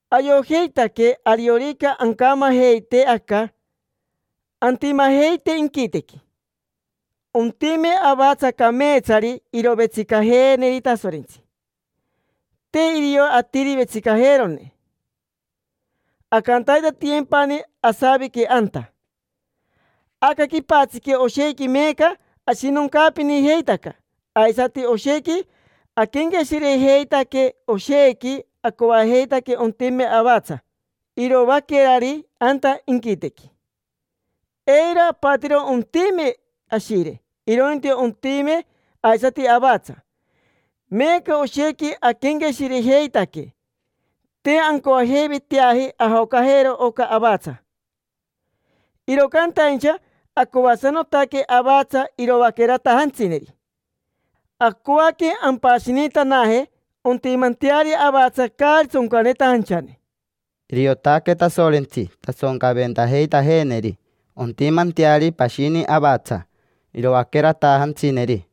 Ayojeitaque ariorica ancamajeite aca, antimajeite inquitequi. Ontime avatsa cameetsari irovetsicajeeneri Tasorentsi, te irio atiri vetsicajeerone. Ancantaitatiyempani asavique anta. Aca quipatsiqui oshequi meeca ashinoncaapinijeitaca aisati oshequi aquenqueshirejeitaque; oshequi acoajeitaque ontime avatsa iroaquerari anta inquitequi. Eiro apatiro ontime ashire, irointi ontime aisati avatsa. Meeca oshequi aquenqueshirejeitaque: te ancoajeiveteaji ajocajero oca avatsa, iro cantaincha acoasanotaque avatsa iroaqueratajantsineri. Acoaque ampashinitanaje ontimanteari avatsa caari tsoncanetajanchane. Iriotaque Tasorentsi tasoncaventajeitajeeneri ontimanteari pashini avatsa iroaqueratajantsineri.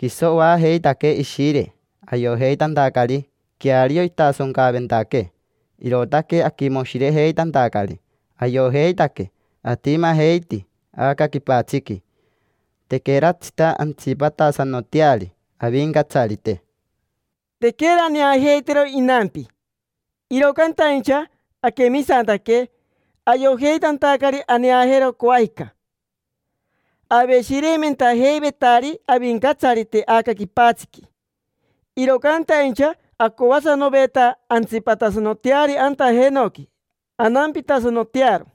Quiso oajeitaquee Ishire ayojeitantacari queario intasoncaventaquee, irootaque aquimoshirejeitantacari. Ayojeitaque atimajeiti aca quipatsiqui, tequeratsita antsipatasanoteari Avincatsarite. Tequera aneajeitero inampi, iro cantaincha aquemisantaque, ayojeitantacari aneajero coajica. Aveshireimentajeivetari Avincatsarite aca quipatsiqui, iro cantaincha acoasanoveta antsipatasanoteari anta jenoqui, anampitasanotearo.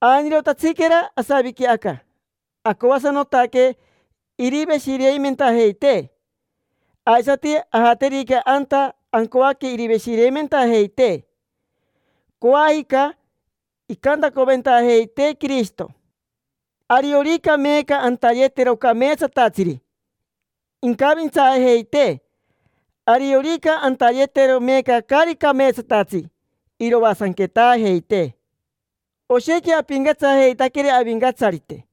Ainirotatsiquera asaviqui aca, acoasanotaque iriveshireimentajeitee. Aisati, ajaterica anta ancoaque iriveshireimentajeitee. Coajica incantacoventajeitee Quirishito. Ariorica meeca antayetero cameetsatatsiri, incavintsaajeitee; ariorica antayetero meeca caari cameetsatatsi, iroasanquetaajeitee. Oshequi apincatsajeitaqueri Avincatsarite,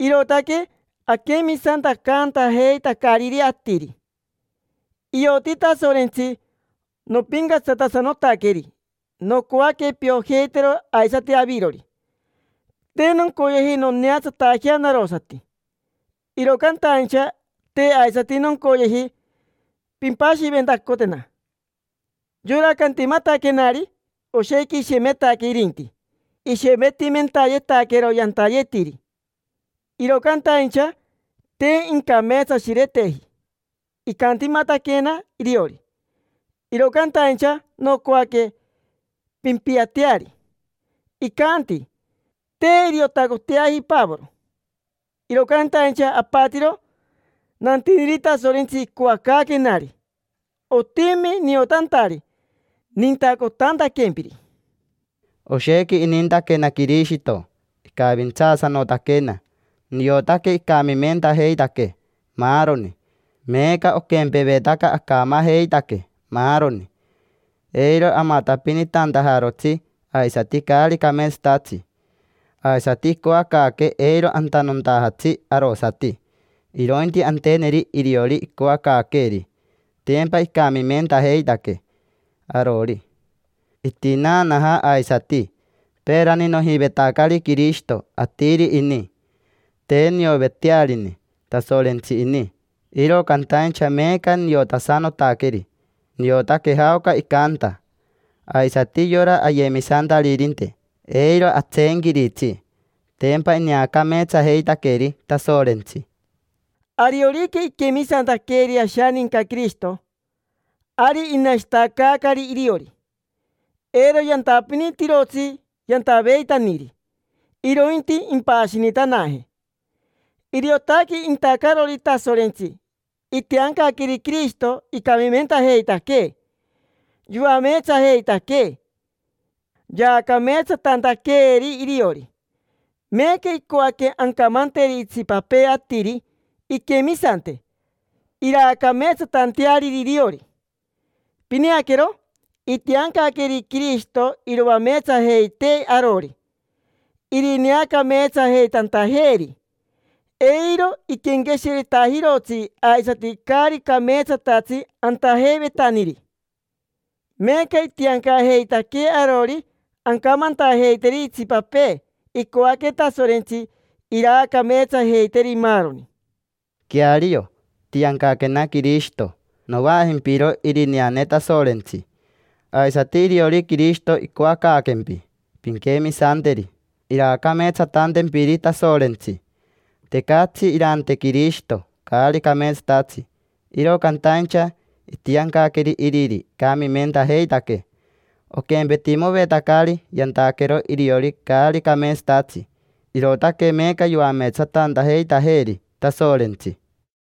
irootaque aquemisantacaantajeitacariri atiri. Ioti Tasorentsi nopincatsatasanotaqueri, nocoaque piojeitero aisati avirori. Te noncoyeji noneatsatajea narosati, iro cantaincha te aisati noncoyeji pimpashiventacotena. Yora cantimataquenari, oshequi ishemetaque irinti, ishemetimentayetaquero yantayetiri, iro cantaincha te incameetsashireteji. Icantimataquena iriori, iro cantaincha nocoaque pimpiateari. Icanti: “Te iriotacoteaji Pavoro”, iro cantaincha apatiro nantiniri Tasorentsi icoacaaquenari. Otimi niotantari nintacotantaquempiri. Oshequi inintaquena Quirishito, icavintsaasanotaquena. Niotaque icamimentajeitaquee maaroni: meeca oquempevetaca acamajeitaque maaroni, eiro amatapinitantajarotsi aisati caari cameetsatatsi. Aisati icoacaaquee eiro antanontajatsi arosati, irointi anteneri iriori icoacaaqueeri: tempa icamimentajeitaquee arori, itinaanaja aisati. Peerani nojivetacari Quirishito atiri ini, te niovetearini Tasorentsi ini. Iro cantaincha meeca niotasanotaqueri, niotaque jaoca icanta. Aisati yora ayemisantaririnte, eiro atseenquiritsi: tempa ineacameetsajeitaqueri Tasorentsi. Ariorica iquemisantaqueri ashaninca Quirishito, ari inashitacaacari iriori; eiro yantapinitirotsi yantaveitaniri, irointi impashinitanaje. Iriotaque intacarori Tasorentsi. Itiancaqueri Quirishito icamimentajeitaquee, yoameetsajeitaquee, yaacameetsatantaqueeri iriori. Meeca icoaque ancamanteri itsipapee atiri inquemisante, iraacameetsatanteariri iriori. Pineaquero, itiancaqueri Quirishito iroameetsajeitee arori, irineacameetsajeitantajeeri. Eiro iquenqueshiretajirotsi aisati caari cameetsatatsi antajeivetaniri. Meeca itiancajeitaquee arori ancamantajeiteri itsipapee icoaque Tasorentsi iraacameetsajeiteri, maaroni. Queario, itiancaquena Quirishito: novaajimpiro irineane Tasorentsi. Aisati iriori Quirishito icoacaaquempi pinquemisanteri iraacameetsatantempiri Tasorentsi. Tecatsi irante Quirishito caari cameetsatatsi, iro cantaincha itiancaqueri iriri icamimentajeitaquee. Oquempetimovetacari yantaquero iriori caari cameetsatatsi. Irootaque meeca yoameetsatantajeitajeeri Tasorentsi.